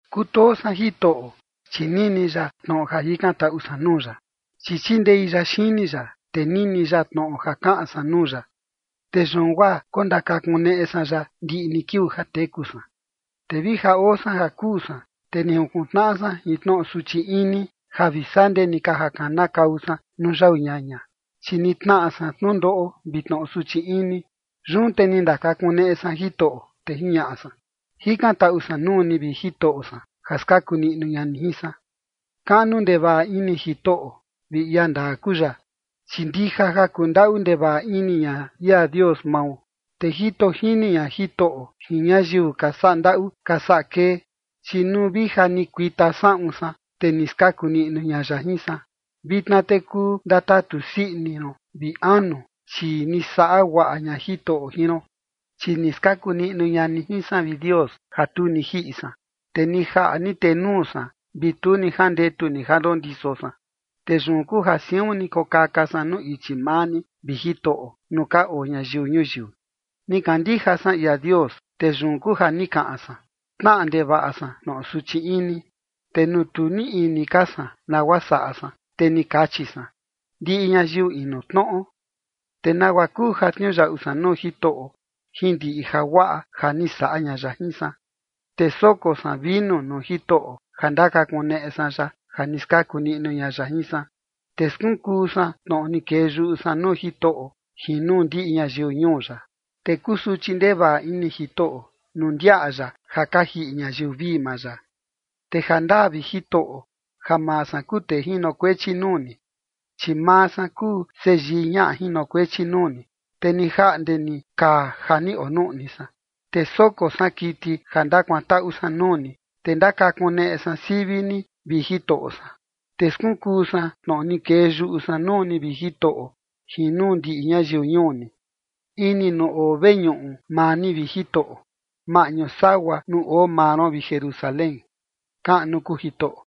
Kutoo san Jitoꞌo, chi nini ya tnoꞌo ja jikantaꞌu san nuu ya. Chi chindei ya xini ya, te nini ya tnoꞌo ja kaꞌan san nuu ya, te yun guaa kondakakuneꞌe san ya ndiꞌi ni kiuu ja teku san. Te vi ja oo san ja kuu san, te ni junkuntnaꞌa san jin tnoꞌo suchi ini ja vi sandee ni ka ja kanakau san nuu yau ñaña, chi ni tnaꞌa san tnundoꞌo vi tnoꞌo suchi ini. Yun te ni ndakakuneꞌe san Jitoꞌo, te jiñaꞌa san: “Jikantaꞌu san nuu ni, vi Jitoꞌo san, ja skaku niꞌnu ña ni jin san”. Kaꞌnu ndevaꞌa ini Jitoꞌo vi ia ndaa kuu ya, chi ndija ja kundaꞌu ndevaꞌa ini ña ia Dios mao. Te jito jini ña Jitoꞌo jin ñayiu ka saꞌa ndaꞌu ka saꞌa kee, chi nuu vi ja ni kuita saꞌun san, te ni skaku niꞌnu ña ya jin san. Vitna te kuu ndatatu sii ini ron, vi anu, chi ni saꞌa guaꞌa ña Jitoꞌo jin ron. Chi ni skaku niꞌnu ña ni jin san, vi Dios, ja tu ni jiꞌi san, te ni jaꞌa ni tenuu san, vi tu ni jandetu ni ja ndondiso san. Te yun kuu ja siun ni kokaka san nuu ichi maa ni, vi Jitoꞌo, nuu ka oo ñayiu ñuyiu. Ni kandija san ia Dios, te yun guaa ni kaꞌan san: “Tnaꞌa ndevaꞌa san tnoꞌo suchi ini”, te nuu tu ni niꞌi ini ka san nagua saꞌa san, te ni kachi san: “Ndiꞌi ñayiu inu tnoꞌo”. ¿Te nagua kuu ja tniuyaꞌu san nuu Jitoꞌo, jin ndiꞌi jaguaꞌa ja ni saꞌa ña ya jin san? Te soko san vinu nuu Jitoꞌo ja ndakakuneꞌe san ya ja ni skaku niꞌnu ña ya jin san. Te skunkuu san tnoꞌo ni kee yuꞌu san nuu Jitoꞌo jin nuu ndiꞌi ñayiu ñuu ya. Te kusuchi ndevaꞌa ini Jitoꞌo nuu ndiaꞌa ya ja ka jiꞌi ñayiu vii maa ya. Te jandaa, vi Jitoꞌo, ja maa san kuu tee jinokuechi nuu ni, chi maa san kuu seyii ñaꞌa jinokuechi nuu ni, te ni jaꞌnde ni kaa ja ni onuꞌni san. Te soko san kiti ja ndakuantaꞌu san nuu ni, te ndakakuneꞌe san sivi ni, vi Jitoꞌo san. Te skunkuu san tnoꞌo ni kee yuꞌu san nuu ni, vi Jitoꞌo, jin nuu ndiꞌi ñayiu ñuu ni, ini nuu oo veñuꞌu maa ni, vi Jitoꞌo, maꞌñu sagua nuu oo maa ron, vi Jerusalén. ¡Kaꞌnu kuu Jitoꞌo!